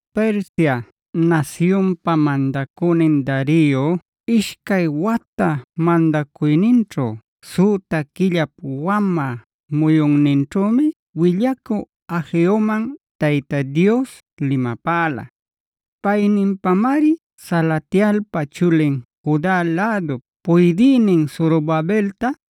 Persia nasyunpa mandacünin Dario ishcay wata mandacuyninćhu süta quillap wamä muyunninćhümi willacü Hageoman Tayta Dios limapäla. Payninpamari Salatielpa chulin Juda lädup puydïnin Zorobabelta,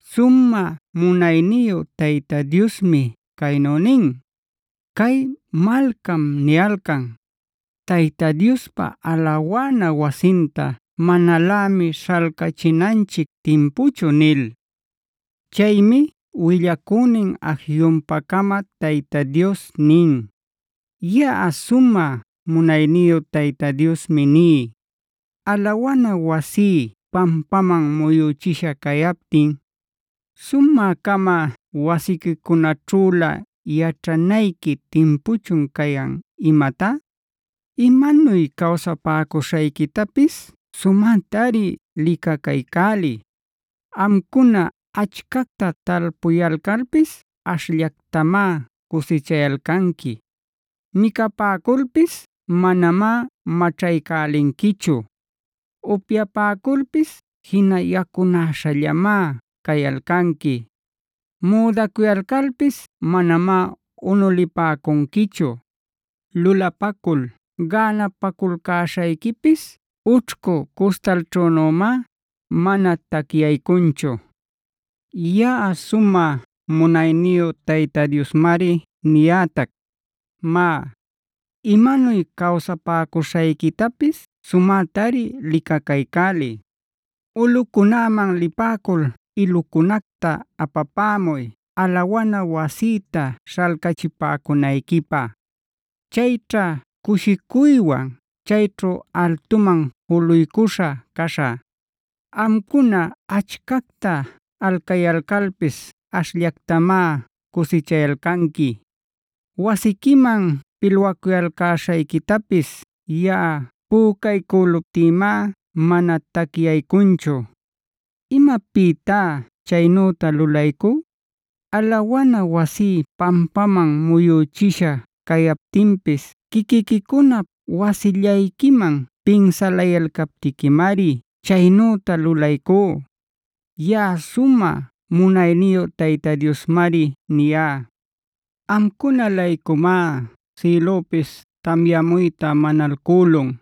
Sumä munayniyu Tayta Diosmi caynu nin: “Cay malcam niyalcan: ‘Tayta Diospa alawana wasinta manalämi śhalcachinanchic timpuchu’” nil. Chaymi willacünin Hageonpa-cama Tayta Dios nin: “Yaꞌa sumä munayniyu Tayta Diosmi ní: Alawana wasí pampaman muyüchisha cayaptin, ¿sumä-cama wasiquicunaćhülä yaćhanayqui timpuchun cayan imatá? Imanuy cawsapäcuśhayquitapis sumätari licacaycäliy. Amcuna achcacta talpucuyalcalpis ashllactamá cusichayalcanqui. Micapäculpis manamá maćhaycälinquichu. Upyapäculpis jina yacunäśhallamá cayalcanqui. Müdacuyalcalpis manamá unulipäcunquichu. Lulapacul gänapaculcäśhayquipis ućhcu cuśhtalćhünümá mana tacyaycunchu. “Yaꞌa sumä munayniyu Tayta Diosmari niyätac: Má, imanuy cawsapäcuśhayquitapis sumätari licacaycäliy. Ulꞌucunäman lipäcul ilucunacta apapämuy alawana wasïta śhalcachipäcunayquipä. Chayćha cushicuywan chayćhu altuman juluycuśha caśhä. “Amcuna achcacta alcayalcalpis ashllactamá cusichayalcanqui. Wasiquiman pilwaculcäśhayquitapis yaꞌa pücaycüluptïmá mana tacyaycunchu. ¿Imapïtá chaynüta lulaycú? Alawana wasí pampaman muyüchisha cayaptinpis quiquiquicunap wasillayquiman pinsalayalcaptiquimari chaynüta lulaycú. Yaꞌa sumä munayniyu Tayta Diosmariniyá. Amcuna-laycumá sïlüpis tamyamuyta manalcülun;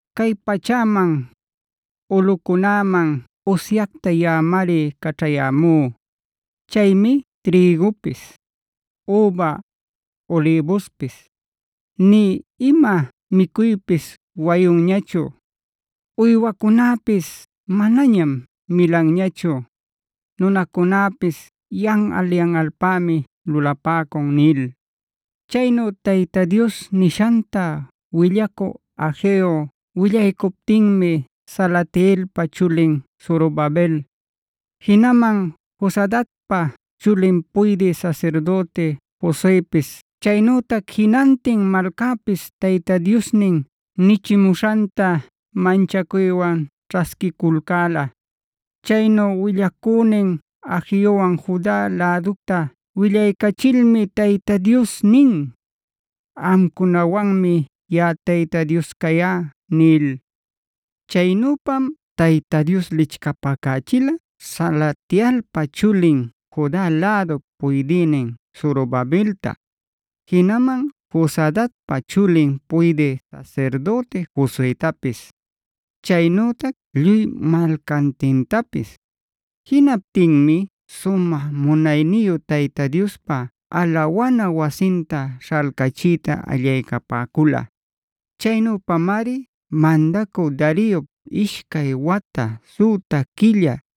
Cay pachäman, ulꞌucunäman usyacta yaꞌamari caćhayämú. Chaymi trïgupis, üba, ulïbuspis, nï ima micuypis wayunñachu. Uywacunäpis manañam milanñachu; nunacunäpis yanꞌal-yanꞌalpämi lulapäcun” nil. Chaynu Tayta Dios nishanta willacü Hageo willaycuptinmi Salatielpa chulin Zorobabel, jinaman Josadacpa chulin puydï sasirdüti Josuepis chaynütac jinantin malcäpis Tayta Diosnin nichimuśhanta manchacuywan ćhasquiculcäla. Chaynu willacünin Hageowan Juda läducta willaycachilmi Tayta Dios nin: “Amcunawanmi yaꞌa Tayta Dios cayá” nil. Chaynüpam Tayta Dios lichcapacächila Salatielpa chulin Juda lädup puydïnin Zorobabelta, jinaman Josadacpa chulin puydï sasirdüti Josuetapis, chaynütac lluy malcantintapis. Jinaptinmi sumä munayniyu Tayta Diospa alawana wasinta śhalcachiyta allaycapäcula. Chaynüpamari mandacü Dariop ishcay wata, süta quilla,